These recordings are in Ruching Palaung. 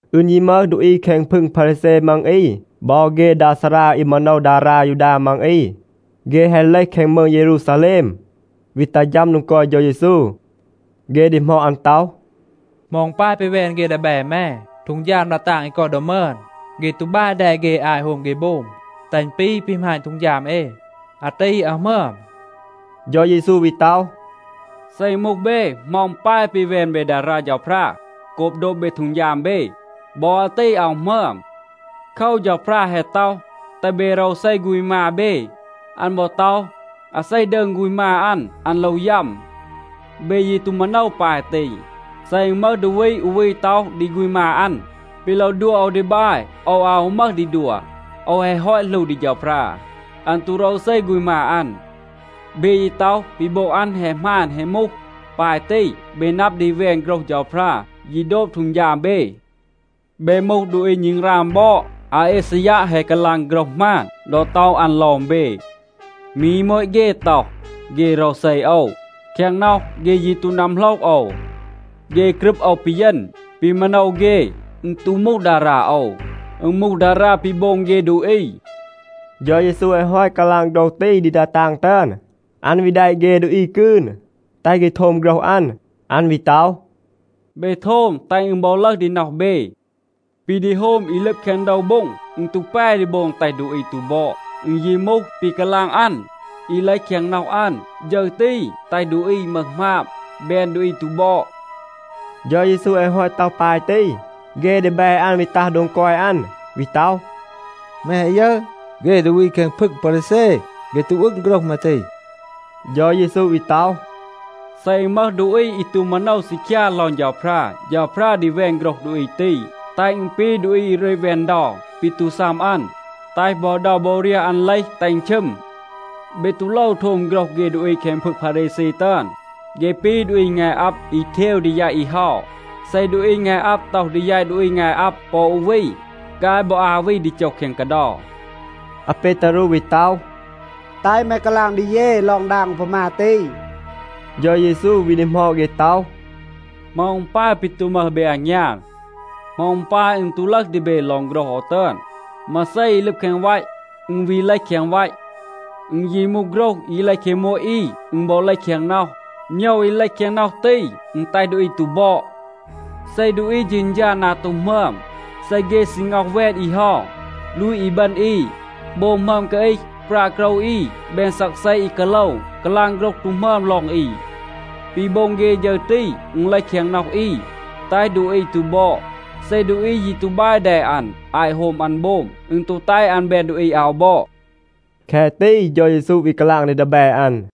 อึณ ยี มึห ดูอี แคง พึง พารีแซ มัง อี บอ เฆ ดา ซารา อี มาโนว ดารา ยูดา มัง อี, เฆ แฮะ เลห แคง มืง เยรูซาแลม, วี ตัห ฌัม โดง กอย เฌา เยซู. เฆ ดีหมอด อัน ต็อห, “เหมา อึณ ปาย ปี แวน เฆ ดีแบ แม ฮีด ดา ตาง อี กอย ดอ มึอน? เฆ ตู บาย แด เฆ อาต โฮม เฆ โบม, แตห อึณ ปี ปี หมาณ ฮีด เอ. อาตี อาว หมึอม.” เฌา เยซู วี ต็อห, “เซ อึณ มูห เบ, เหมา อึณ ปาย ปี แวน เบ ดารา เฌาพรา โกบ โดบ เบ ฮีด เบ? บอ อาตี อาว หมึอม. โคว, เฌาพรา แฮะ ต็อห, ‘แตห เบ โรวเซ ฆูณ มา เบ.’ อัน บอ ต็อห, ‘อาเซ ดืง ฆูณ มา อัน, อัน โลว ยัม.’ เบ ยี ตู มาโนว ปาย ตี. เซ อึณ มึห ดูอี อู วี ต็อห ดี ฆูณ มา อัน, ‘ปี โลว ดัว โอว ดี บาย, โอว อาว ฮู มึห ดี ดัว. โอว แฮะ ฮอต หลู ดี เฌาพรา,’ อัน ตู โรวเซ ฆูณ มา อัน. เบ ยี ต็อห, ปี โบง อัน แฮะ หมาน แฮะ มูห. ปาย ตี เบ นับ ดี แวน โฆรห เฌาพรา, ยี โดบ ฮีด เบ. เบ มูห ดูอี ณึงราง บอด. อาอีซายัะ แฮะ กาลาง โฆรห หมาน ดอ ต็อห อัน ลอง เบ, ‘มี โมต เฆ ต็อห, เฆ โรวเซ โอว. แคง น็อห, เฆ ยี ตู นัมโหลห โอว. เฆ กรึบ โอว ปีเยณ. ปี มาโนว เฆ, อึณ ตู มูห ดารา โอว. อึณ มูห ดารา ปี โบง เฆ ดูอี.’” เฌา เยซู แฮะ ฮอต กาลาง โฆรห ตี ดี ดา ตาง ตึอน, อัน วี แดะ เฆ ดูอี กืน, แตห เฆ โทม โฆรห อัน. อัน วี ต็อห, “เบ โทม, แตห อึณ บอ ลึห ดี น็อห เบ. ปี ดี โฮม อี ลึบ แคง โดว โบ็ง, อึณ ตู แป ดี โบง แตห ดูอี ตู บอด. อึณ ยี มูห ปี กาลาง อัน, อี เลห แคง น็อห อัน, ฌึร ตี แตห ดูอี มึห หมาบ, แบน ดูอี ตู บอด.” เฌา เยซู แฮะ ฮอต ต็อห ปาย ตี, เฆ ดีแบ อัน วี ตัห โดง กอย อัน, วี ต็อห, “แม แฮะ ยึร, เฆ ดูอี แคง พึง พารีแซ, เฆ ตู อึง โฆรห แม ตี?” เฌา เยซู วี ต็อห, “เซ อึณ มึห ดูอี อี ตู มาโนว ซีคยา ลอง เฌาพรา, เฌาพรา ดี แวน โฆรห ดูอี ตี, แตห อึณ ปี ดูอี อี รึต แวน เดา ปี ตู ซัม อัน, แตห บอ เดา บอ เรียห อัน เลห, แตห อึณ ชึม. เบ ตู โลว โทม โฆรห เฆ ดูอี แคง พึง พารีแซ ตึอน. เฆ ปี ดูอี งาย อับ อี เทว ดี แยต อี เฮา. เซ ดูอี งาย อับ ต็อห ดี แยต ดูอี งาย อับ ปอ อู วี, ฆาย บอ อา วี ดี โจห แคง กาเดา.” อาเปตารู วี ต็อห, “แตห แม กาลาง ดี เย ลอง ดาง อูพามา ตี.” เฌา เยซู วี ดีหมอด เฆ ต็อห, “เหมา อึณ ปาย ปี ตู มึห เบ อางยาน? เหมา อึณ ปาย อึณ ตู ลึห ดี เบ ลอง โฆรห โอว ตึอน? มาเซ อี ลึบ แคง วัต, อึณ วี เลห แคง วัต. อึณ ยี มูห โฆรห อี เลห แคง โมต อี, อึณ บอ เลห แคง น็อห. โมยว อี เลห แคง น็อห ตี, อึณ แตห ดูอี ตู บอด. เซ ดูอี เฌณฌา นา ตู หมึอม, เซ เฆ ซี ง็อห แวน อี เฮา, ลูต อีบึณ อี, โบง หมึอม กาอีห, ปรา โกรว อี, แบน ซักเซ อี กาโลว, กาลาง โฆรห ตู หมึอม ลอง อี, ปี โบง เฆ ฌึร ตี, อึณ เลห แคง น็อห อี, แตห ดูอี ตู บอด. เซ ดูอี ยี ตู บาย แด อัน อาต โฮม อัน โบม, อึณ ตู แตห อัน แบน ดูอี อาว บอด.” แคะ ตี เฌา เยซู วี กาลาง ดี ดีแบ อัน.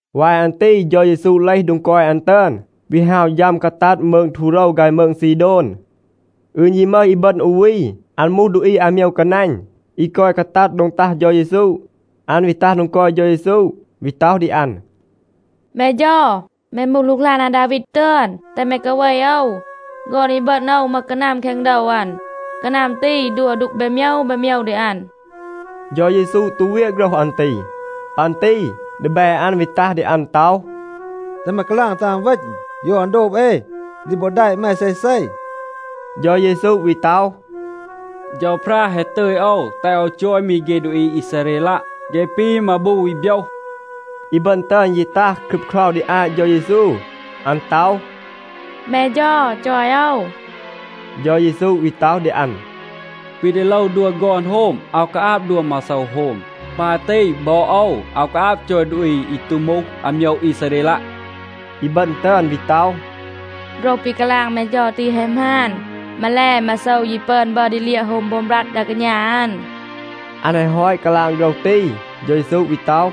วาย อัน ตี เฌา เยซู เลห โดง กอย อัน ตึอน, วี ฮาว ฌัม กาตัด มืง ทูโรว ฆาย มืง ซีโดน. อึณ ยี มึห อีบึณ อู วี, อัน มูห ดูอี อาโมยว กานัณ อี กอย กาตัด โดง ตัห เฌา เยซู. อัน วี ตัห โดง กอย เฌา เยซู วี ต็อห ดี อัน, “แม เฌา, แม มูห หลูกหลาน อาดาวีด ตึอน,a แตห แม กาเว โอว. ฆอน อีบึณ โอว มึห กานัม แคง โดว อัน. กานัม ตี ดัว ดูก แบน โมยว แบน โมยว ดี อัน.” เฌา เยซู ตู เวียะ โฆรห อัน ตี. ปัน ตี ดีแบ อัน วี ตัห ดี อัน ต็อห, “แตห แม กาลาง, แตห อัน เวณ. โยว อัน โดบ เอ, ดี บอ แดะ แม เซเซ.” เฌา เยซู วี ต็อห, “เฌาพรา แฮะ ตึย โอว แตห โอว จอย มี เฆ ดูอี อีซาเรลัะ. เฆ ปี มาบู อี โบยห.” อีบึณ ตึอน ยี ตัห, ครึบเครา ดี อาต เฌา เยซู. อัน ต็อห, “แม เฌา, จอย โอว.” เฌา เยซู วี ต็อห ดี อัน, “ปี ดี โลว ดัว ฆอน โฮม, อาว กาอาบ ดัว มาโซว โฮม.b ปาย ตี บอ โอว อาว กาอาบ จอย ดูอี อี ตู มูห อาโมยว อีซาเรลัะ.” อีบึณ ตึอน วี ต็อห, “โฆรห ปี กาลาง แม เฌา ตี แฮะ หมาน. มาแล, มาโซว ยี ปึอน บัร ดี เลียะ โฮม โบม บรัด ดา กาณา อัน.” อัน แฮะ ฮอต กาลาง โฆรห ตี, เฌา เยซู วี ต็อห,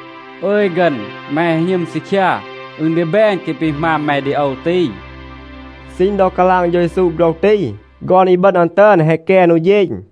“อึย ฆึณ, แม แฮะ หณึม ซีคยา. อึณ ดี แบน แคะ ปี หมาณ แม ดี โอว ตี.” ซีณ ดอ กาลาง เฌา เยซู โฆรห ตี, ฆอน อีบึณ อัน ตึอน แฮะ แกน อู เฌณ.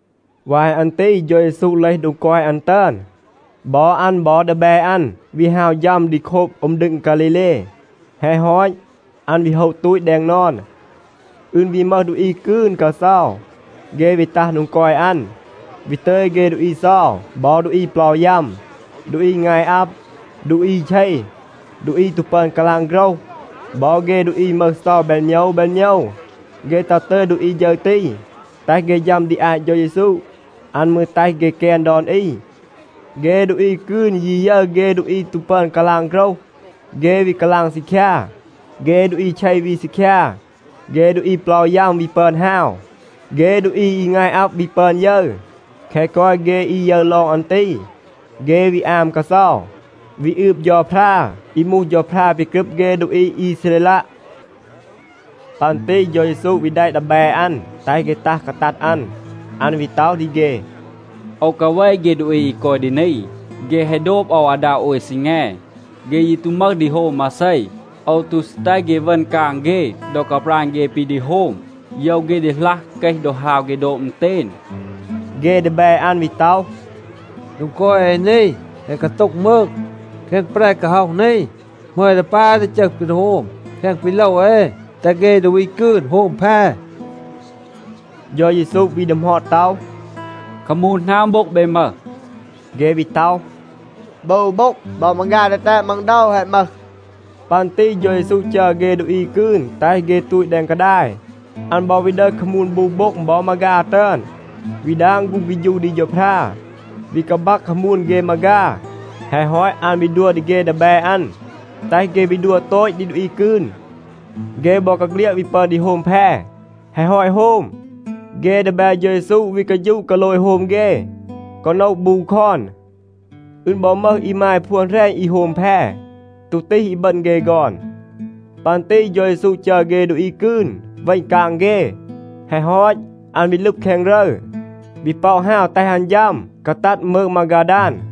วาย อัน ตี เฌา เยซู เลห โดง กอย อัน ตึอน. บอ อัน บอ ดีแบ อัน วี ฮาว ฌัม ดี โคบ อึม ดึง ฆาลีเล. แฮะ ฮอต, อัน วี โฮะ ตูต แดง นอน. อึณ วี มึห ดูอี กืน กาเซา, เฆ วี ตัห โดง กอย อัน, วี ตึย เฆ ดูอี เซา บอ ดูอี เปลา ยัม, ดูอี งาย อับ, ดูอี เช, ดูอี ตู ปึอน กาลาง โฆรห บอ เฆ ดูอี มึห เซา แบน โมยว แบน โมยว. เฆ ตัห ตึย ดูอี ฌึร ตี, แตห เฆ ฌัม ดี อาต เฌา เยซู. อัน มืร แตห เฆ แกน ดอน อี. เฆ ดูอี กืน ยี ยึร เฆ ดูอี ตู ปึอน กาลาง โฆรห, เฆ วี กาลาง ซีคยา. เฆ ดูอี เช วี ซีคยา, เฆ ดูอี เปลา ยัม วี ปึอน ฮาว, เฆ ดูอี อี งาย อับ วี ปึอน ยึร. แคะ กอย เฆ อี ยึร ลอง อัน ตี, เฆ วี อาม กาเซา, วี อืบ เฌาพรา อี มูห เฌาพรา ปี กรึบ เฆ ดูอี อีซาเรลัะ. ปัน ตี เฌา เยซู วี แดะ ดีแบ อัน แตห เฆ ตัห กาตัด อัน. อัน วี ต็อห ดี เฆ, “โอว กาเว เฆ ดูอี อี กอย ดี นี. เฆ แฮะ โดบ โอว อาดา โอย ซีแง. เฆ ยี ตู มึห ดี โฮม มาเซ. โอว ตู ซี แตห เฆ เวณ กาง เฆ ดอ กาปราณ เฆ ปี ดี โฮม. โยว เฆ ดีหลัห เกห ดอ ฮาว เฆ โดบ อึณเตณ.” เฆ ดีแบ อัน วี ต็อห, “โดง กอย เอ นี แฮะ กาโต็ง มืง. แคง แปร กาฮ็อห นี, เหมา เอ ดี ปาย ดี จึห ปี ดี โฮม แคะ ปี โลว เอ, แตห เฆ ดูอี กืน โฮม แพ?” เฌา เยซู วี ดีหมอด ต็อห, “คามูน หนาง โบ็ง เบ มึห?” เฆ วี ต็อห, “บู โบ็ง. บอ มาฆา ดีแตด มัง โดว แฮะ มึห.” ปัน ตี เฌา เยซู จัร เฆ ดูอี กืน แตห เฆ ตูต แดง กาดาย. อัน บอ วี ดึห คามูน บู โบ็ง บอ มาฆา ตึอน, วี ดาง ฆูง เฆฌู ดี เฌาพรา, วี กาบัก คามูน เฆ มาฆา. แฮะ ฮอต, อัน วี ดัว ดี เฆ ดีแบ อัน, แตห เฆ วี ดัว โตต ดี ดูอี กืน. เฆ บอกาเฆลียด วี ปึอน ดี โฮม แพ. แฮะ ฮอต โฮม, เฆ ดีแบ เฌา เยซู วี กาฌูะ กาโลย โฮม เฆ, กอ โนะ บู คอน. อึณ บอ มึห อีมาย พวน แหรณ อี โฮม แพ. ตู ตีห อีบึณ เฆ ฆอน. ปัน ตี เฌา เยซู จัร เฆ ดูอี กืน เวณ กาง เฆ. แฮะ ฮอต, อัน วี ลึบ แคง รึร, วี ป็อะ ฮาว แตห อัน ฌัม กาตัด มืง มาฆาดาน.